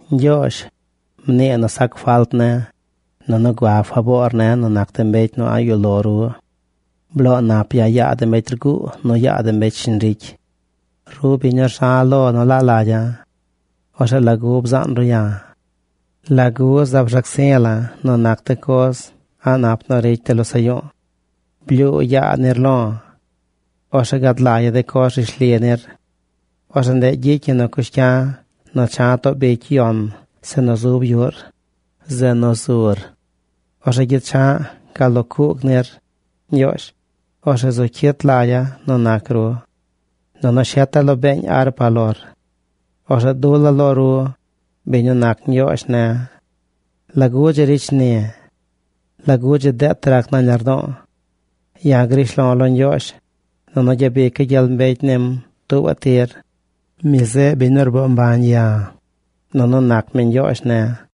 Ñgyoozh, mnii nu sac falt ne̱, nunu gua faboor ne̱ nu nac de mbecy nu a̱ꞌ yuꞌ lo ru. Bloo nap ya̱ yaa de mbecy rguu nu yaa de mbecy shiñ ricy. Ru biñ nu rza̱ lo nu laa lagya̱. Orzeꞌ ¿lagu bzaan ru ya̱? ¿Lagu zaab rzac zi̱ la̱ nu nac de coz a̱ꞌ nap nu ricy de losaꞌ yu̱u̱? Blyuu yaa nir lo̱. Orzeꞌ gad lagya̱ de coz rishli nir. Orzeꞌ ndeꞌ gyicy ñi nu cush cya̱ nu cha̱ too bicy yon zeꞌ nu zub yuꞌr, zeꞌ nu zur. Orzeꞌ gyecha̱ꞌ gal lo cuug nir, Ñgyoozh. Orzeꞌ zu cyit lagya̱ nu nac ru. Nunu sheta̱ lo beeñ arpa lor. Orzeꞌ dula̱ lo ru, biñ nu nac Ñgyoozh ne̱. ¿Lagu dzi ricy shni̱? ¿Lagu dzi deet rac nañ lardo̱o̱? Ya̱ grish lo̱ lo Ñgyoozh, nunu gyabica̱ gyel mbecy nim tuubaꞌ tir. Mi zeꞌ biñ nu rboo mbañ ya̱, nunu nac mi Ñgyoozh ne̱.